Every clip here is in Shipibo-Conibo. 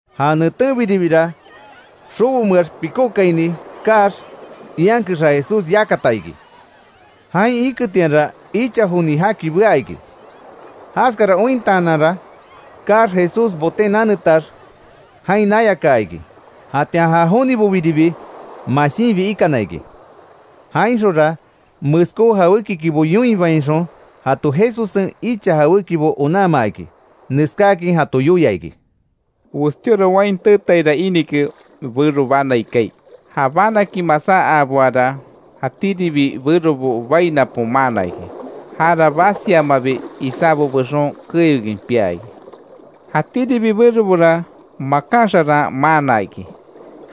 Ja netenbiribira, xobomeax pikókaini kaax, ian kexa Jesús yakata iki. Jain iketianra, icha joni jaki bea iki. Jaskara ointaananra, kaax Jesús boten nanetax jain nayakaa iki. Jatian ja jonibobiribi mashinbi ikana iki. Jainxonra, meskó jawékikibo yoinbainxon jato Jesussen icha jawékibo onanmaa iki. Neskáakin jato yoia iki: “Westíora wain teetaira inike bero banai kaai. Ja banakin masá aaboara, jatíribi berobo bai napon maana iki. Jara basiamabi isábo bexon keyokin pia iki. Jatíribi berobora makan xaran maana iki.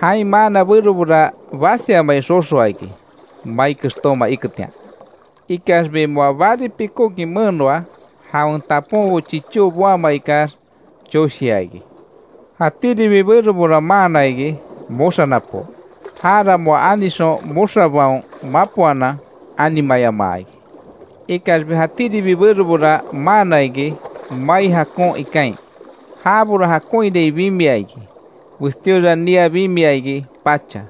Jain maana berobora basiamai xoxoa iki, mai kextóma iketian. Ikaxbi moa bari pikókin menoa, jawen taponbo chichó boama ikax, choshia iki. Jatíribi berobora maana iki, moxa napo. Jara moa anixon, moxabaon mapoanan animayamaa iki. Ikaxbi jatíribi berobora maana iki, mai jakon ikain. Jabora jakonhirai bimia iki. Westíora nia bimia iki, pacha.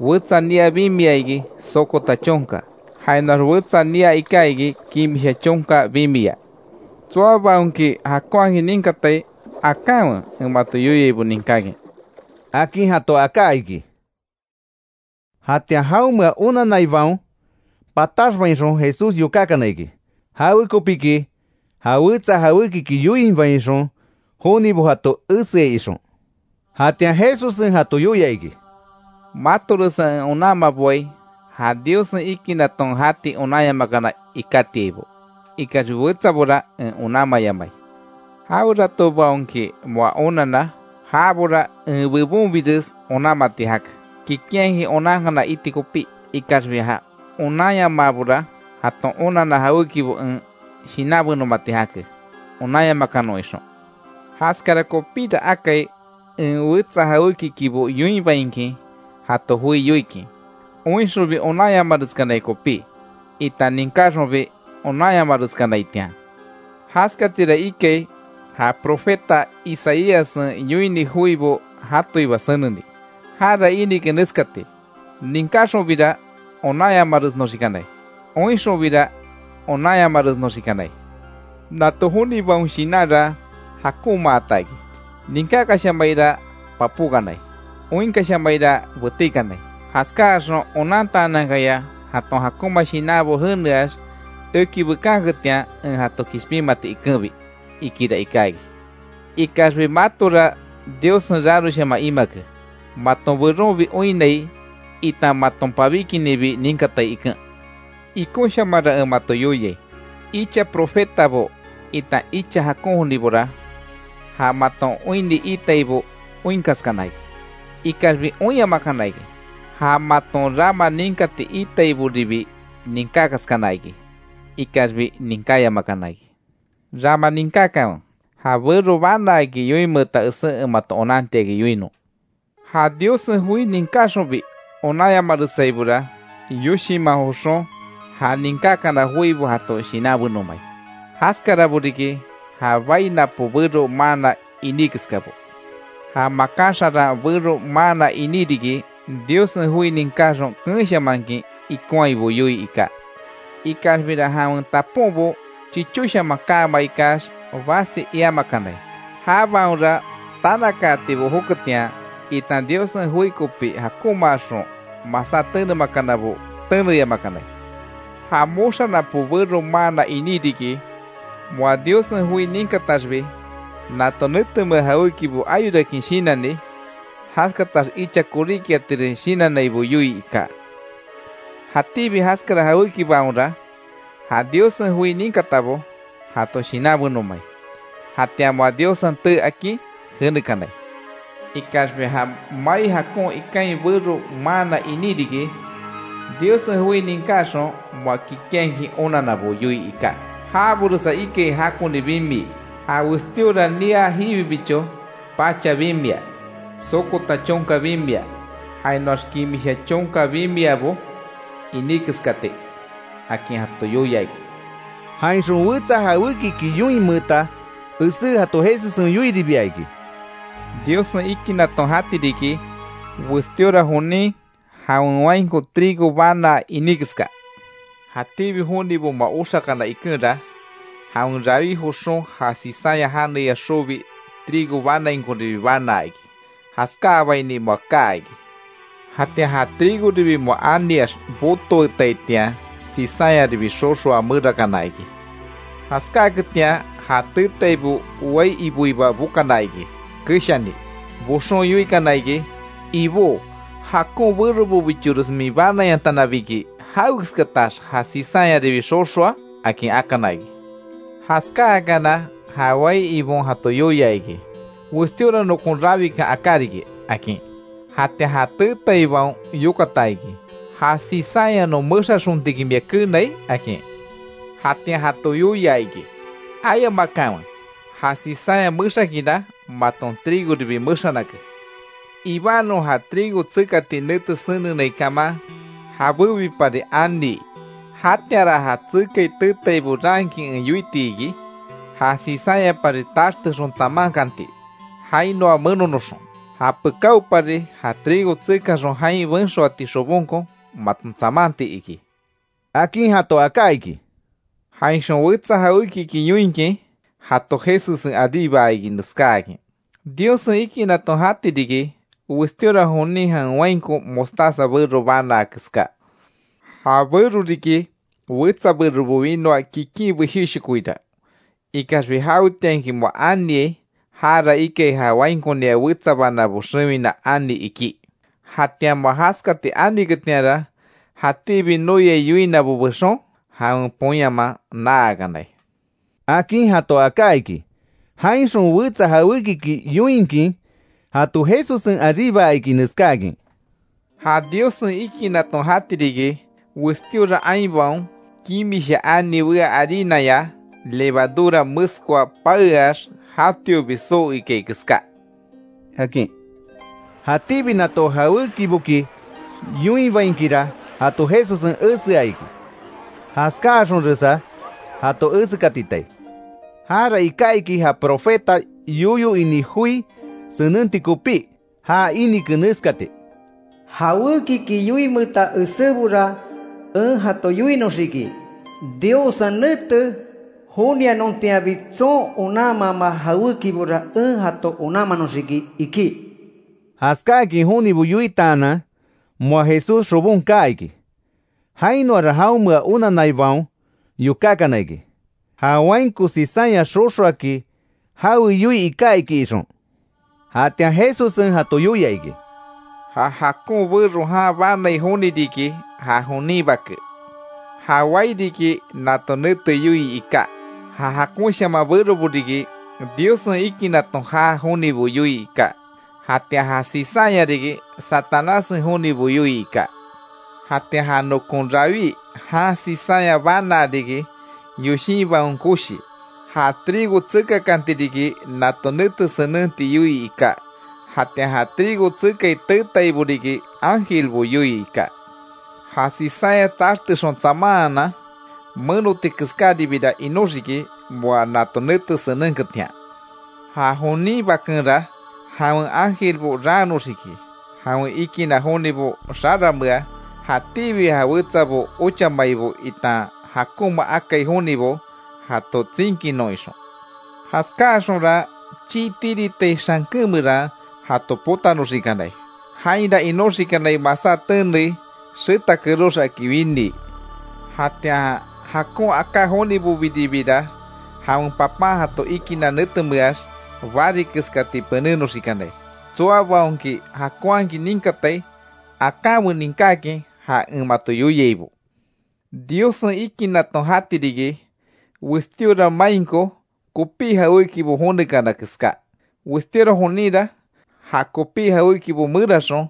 Wetsa nia bimia iki, sokota chonka. Jainoax wetsa nia iká iki, kimisha chonka bimiya. Tsoabaonki jakonhakin ninkatai, akanwe en mato yoiaibo ninkákin”, akin jato aká iki. Jatian jaonmea onanaibaon pataxbainxon Jesús yokákana iki. Jawekopiki jawetsa jawékiki yoinbainxon jonibo jato eseai ixon. Jatian Jesussen jato yoia iki: “Matoresa en onanmaboai ja Diossen ikinaton jati onanyamakana ikátiaibo. Ikaxbi, wetsabora en onanmayamai. Jaweratobaonki moa onanna, jabora en bebonbires onanmati jake, kikinhakin onankana iti kopí. Ikaxbi ja onanyamabora, jaton onanna jawékibo en shinanbenomati jake, onanyamakanon ixon. Jaskara kopíra akai en wetsa jawékikibo yoinbainkin jato joi yoikin. Oinxonbi onanyamareskanai kopí itan ninkáxonbi onanyamareskanaitian. Jaskatira ikai ja profeta Isaíassen yoini joibo jatoiba seneni. Jara inike neskati: ‘Ninkáxonbira onanyamaresnoxikanai. Oinxonbira, onanyamaresnoxikanai. Nato jonibaon shinanra jakonmaata iki. Ninkákashamaira papókanai. Oinkashamaira betíkanai. Jaskáaxon onantaanankaya jaton jakonma shinanbo jeneax eki bekanketian en jato kishpinmati ikenbi’, ikira iká iki. Ikaxbi matora Diossen raroshaman imake, maton beronbi oinnai, itan maton pabíkininbi ninkatai iken. Ikonshamanra en mato yoiai: Icha profetabo itan icha jakon jonibora, ja maton oinni iitaibo oinkaskana iki, ikaxbi oinyamakana iki. Ja maton rama ninkati iitaiboribi ninkákaskana iki, ikaxbi ninkáyamakana iki. Rama ninkákanwe, ja bero banaaki yoinmeeta esé en mato onantiakin yoinon. Ja Diossen joi ninkáxonbi onanyamaresaibora, yoshinman joxon ja ninkákana joibo jato shinanbenomai. Jaskarabo riki ja bai napo bero maanna iní keskabo. Ja makan xaran bero maanna iní riki, Diossen joi ninkáxon, keenshamankin ikonhaibo yoii iká. Ikaxbira, jawen taponbo chichóshaman kaama ikax, basi iamakanai. Jabaonra tanakaatibo joketian, itan Diossen joi kopi jakonmaaxon masá tenemakanabo, teneyamakanai. Ja moxa napo bero maana iní riki, moa Diossen joi ninkataxbi, nato netemea jawékibo ayorakin shinanni, jaskatax icha koríkiatires shinannaibo yoii iká. Jatíbi jaskara jawékibaonra ja Diossen joi ninkatabo jato shinanbenomai, jatian moa Diossen tee akin jenekanai. Ikaxbi ja mai jakon ikain bero maana iní riki, Diossen joi ninkáxon moa kikinhakin onanabo yoii iká. Jaboresa ikai jakoni bimii, ja westíora nia jiwibicho, pacha bimia, sokota chonka bimia, jainoax kimisha chonkabo bimiabo iní keskati”, akin jato yoia iki. Jainxon wetsa jawékiki yoinmeeta esé jato Jesussen yoiribia iki: “Diossen ikinaton jati riki, westíora jonin jawen wainko trigo banaa iní keska. Jatíbi jonibo moa oxakana ikenra, jawen rawí joxon ja cizaña janeya xobi, trigo banaainkoribi banaa iki. Jaskáabaini moa kaa iki. Jatian ja trigoribi moa aniax botoetaitian, cizañaribi xoxoa merakana iki. Jaskáketian, ja teetaibo wai iboiba bokana iki keshani. Boxon yoikana iki: ‘Ibó, jakon berobobichores min banayantanabiki ¿Jawekeskatax ja cizañaribi xoxoa?’ akin akana iki. Jaskáakana, ja wai Ibon jato yoia iki: ‘Westíora nokon rawikan aká riki’, akin. Jatian ja teetaibaon yokata iki: ‘¿Ja cizaña non mexaxontinki mia keenai?’ akin. Jatian jato yoia iki: ‘Ayamakanwe, ja cizaña mexakinra, maton trigoribi mexanake. Ibanon, ja trigo tsekati nete senenai kaman, jabébipari anii. Jatianra ja tsekai teetaibo raankin en yoiti iki, ja cizañapari taxtexon tsamankanti jainoa menonoxon. Japekáopari ja trigo tsekaxon jain benxoati xobonko maton tsamanti iki’”, akin jato aká iki. “Jainxon wetsa jawékiki yoinkin jato Jesussen aríbaa iki neskáakin: Diossen ikinaton jati riki, westíora jonin jawen wainko mostaza bero banaa keská. Ja bero riki, wetsa berobo winoa kikin beshéshokoira. Ikaxbi, jawetianki moa aniai, jara ikai ja wainkonia wetsa banábo xewina ani ikí. Jatian moa jaskati aniketianra, jatíbi noyai yoinabo bexon, jawen poyanman naakanai”, akin jato aká iki. Jainxon wetsa jawékiki yoinkin jato Jesussen aríbaa iki neskáakin: “Ja Diossen ikinaton jati riki, westíora ainbaon, kimisha ani wea harinaya levadura meskoa, paeax jatiobi soo ikai keská”, akin. Jatíbi nato jawékiboki yoinbainkira jato Jesussen esea iki. Jaskáaxonresa jato esekatitai. Jara iká iki ja profeta yoyo ini joi senenti kopí. Ja inike neskati: “Jawekiki yoinmeeta esébora en jato yoinoxiki. Diossen nete jonianontianbi, tson onanama jawékibora en jato onanmanoxiki”, iki. Jaskáakin jonibo yoitaanan, moa Jesús xobon kaa iki. Jainoara jaonmea onanaibaon yokákana iki, ja wainko cizaña xoxoaki jawe yoii iká iki ixon. Jatian Jesussen jato yoia iki: “Ja jakon bero jan banai joni riki, ja jonin Bake. Ja wai riki, nato nete yoii iká. Ja jakonshaman berobo riki, Diossen ikinaton jaa jonibo yoii iká. Jatian ja cizaña riki, Satanássen jonibo yoii iká. Jatian ja nokon rawí jan cizaña banaa riki, yoshinbaon koshi. Ja trigo tsekakanti riki, nato nete senenti yoii iká. Jatian ja trigo tsekai teetaibo riki, ángelbo yoii iká. Ja cizaña taxtexon tsamanhanan menoti keskáribira inoxiki, moa nato nete senenketian. Ja jonin Bakenra, jawen ángelbo raannoxiki, jawen ikinna jonibo xaranmea, jatíbi ja wetsabo ochamaibo itan jakonma akai jonibo, jato tsinkinon ixon. Jaskáaxonra, chii tiritai xanken meran jato potanoxikanai. Jainra inoxikanai, masá tenei, xeta kerox aki winii. Jatian, jakon aká jonibobiribira, jawen Papan jato ikinna netemeax, bari keskati penénoxikanai. Tsoabaonki jakonhakin ninkatai akanwe ninkákin ja en mato yoiaibo. Diossen ikinaton jati riki, westíora mainko kopí jawékibo jonekana keská. Westíora joninra ja kopí jawékibo meraxon,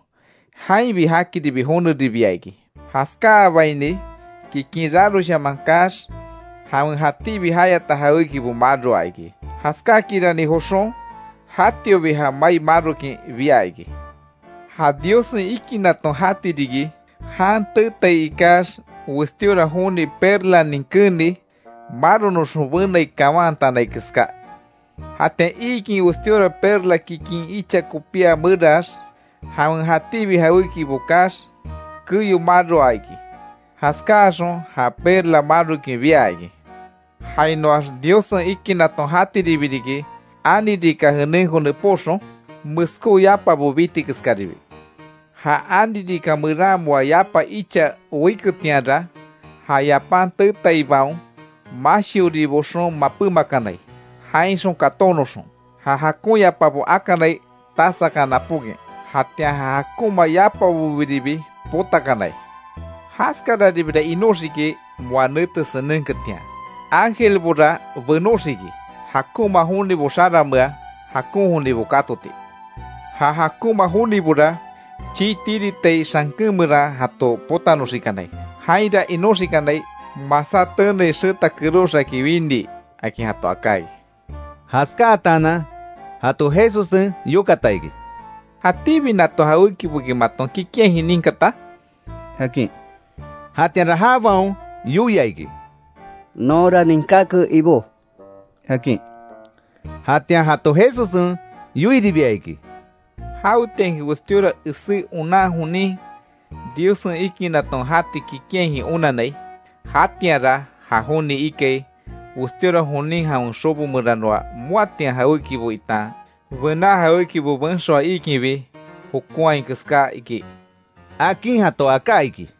jainbi jakiribi joneribia iki. Jaskáabaini kikin raroshaman kaax, jawen jatíbi jayata jawékibo maroa iki. Jaskákirani joxon jatiobi ja mai marokin bia iki. Ja Diossen ikinaton jati riki, jan teetai ikax westíora joni perlanin keeni maronoxon benai kawantanai keská. Jatian iikin, westíora perla kikin icha kopía merax; jawen jatíbi jawékibo kaax keyo maroa iki. Jaskáaxon, ja perla marokin bia iki. Jainoax, Diossen ikinaton jatiribi riki, ani rika jenenko nepóxon, meskó yapabo biti keskaribi. Ja ani rika meran moa yapa icha weiketianra, ja yapan teetaibaon, mashiori boxon mapémakanai jainxon katónoxon. Ja jakon yapabo akanai tasakan napókin, jatian ja jakonma yapabobiribi potakanai. Jaskararibira inoxiki moa nete senenketian. Ángelbora benoxiki, jakonma jonibo xaranmea, jakon jonibo kátoti. Ja jakonma jonibora, chii tiritai xanken meran jato potanoxikanai. Jainra inoxikanai, masá tenei, xeta kerox aki winii”, akin jato aká iki. Jaskáatanan jato Jesussen yokata iki: —¿Jatíbi nato jawékiboki maton kikinhakin ninkata? —akin. Jatianra jabaon yoia iki: —Nonra ninkáke Ibó —akin. Jatian jato Jesussen yoiribia iki: —Jawetianki westíora esé onan jonin, Diossen ikinaton jati kikinhakin onanai, jatianra ja joni ikai, westíora jonin jawen xobo meranoa, moatian jawékibo itan bená jawékibo benxoa iikinbi jokonhai keská ikí —akin jato aká iki.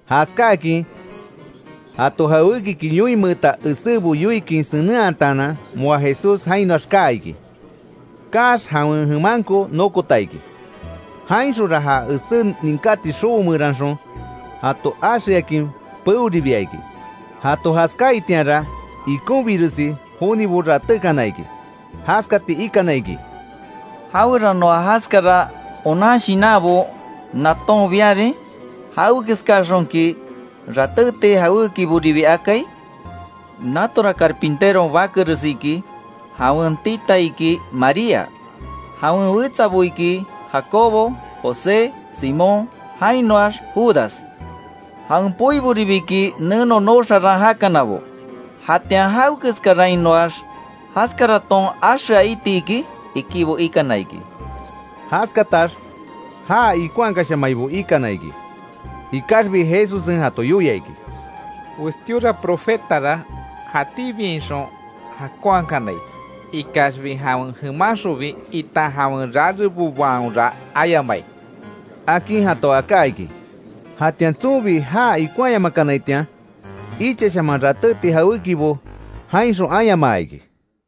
Jaskáakin jato jawékiki yoinmeeta esébo yoikin senenhataanan, moa Jesús jainoax kaa iki. Kaax jawen jemanko nokota iki. Jainxonra ja esé ninkati xobo meranxon jato axeakin peoribia iki. Jato jaskaitianra ikonbiresi jonibo ratékana iki. Jaskati ikana iki: —¿Jaweranoa jaskara onan shinanbo naton biarin? ¿Jawekeskaxonki ratéti jawékiboribi akai? Natora carpinteron bakeres iki. Jawen tita iki María. Jawen wetsabo iki, Jacobo, José, Simón jainoax Judas. Jawen poiboribi iki neno nooxaran jakanabo, ¿Jatian jawekeskarainoax jaskaraton axea itiki? —ikibo ikana iki. Jaskatax, já ikonhakashamaibo ikana iki. Ikaxbi Jesussen jato yoia iki: —Westíora profetara jatíbiainxon jakonhakanai. Ikaxbi, jawen jemanxonbi, itan jawen rarebobaonra ayamai —akin jato aká iki. Jatian tsonbi já ikonhayamakanaitian, ichashaman ratéti jawékibo jainxon ayamaa iki.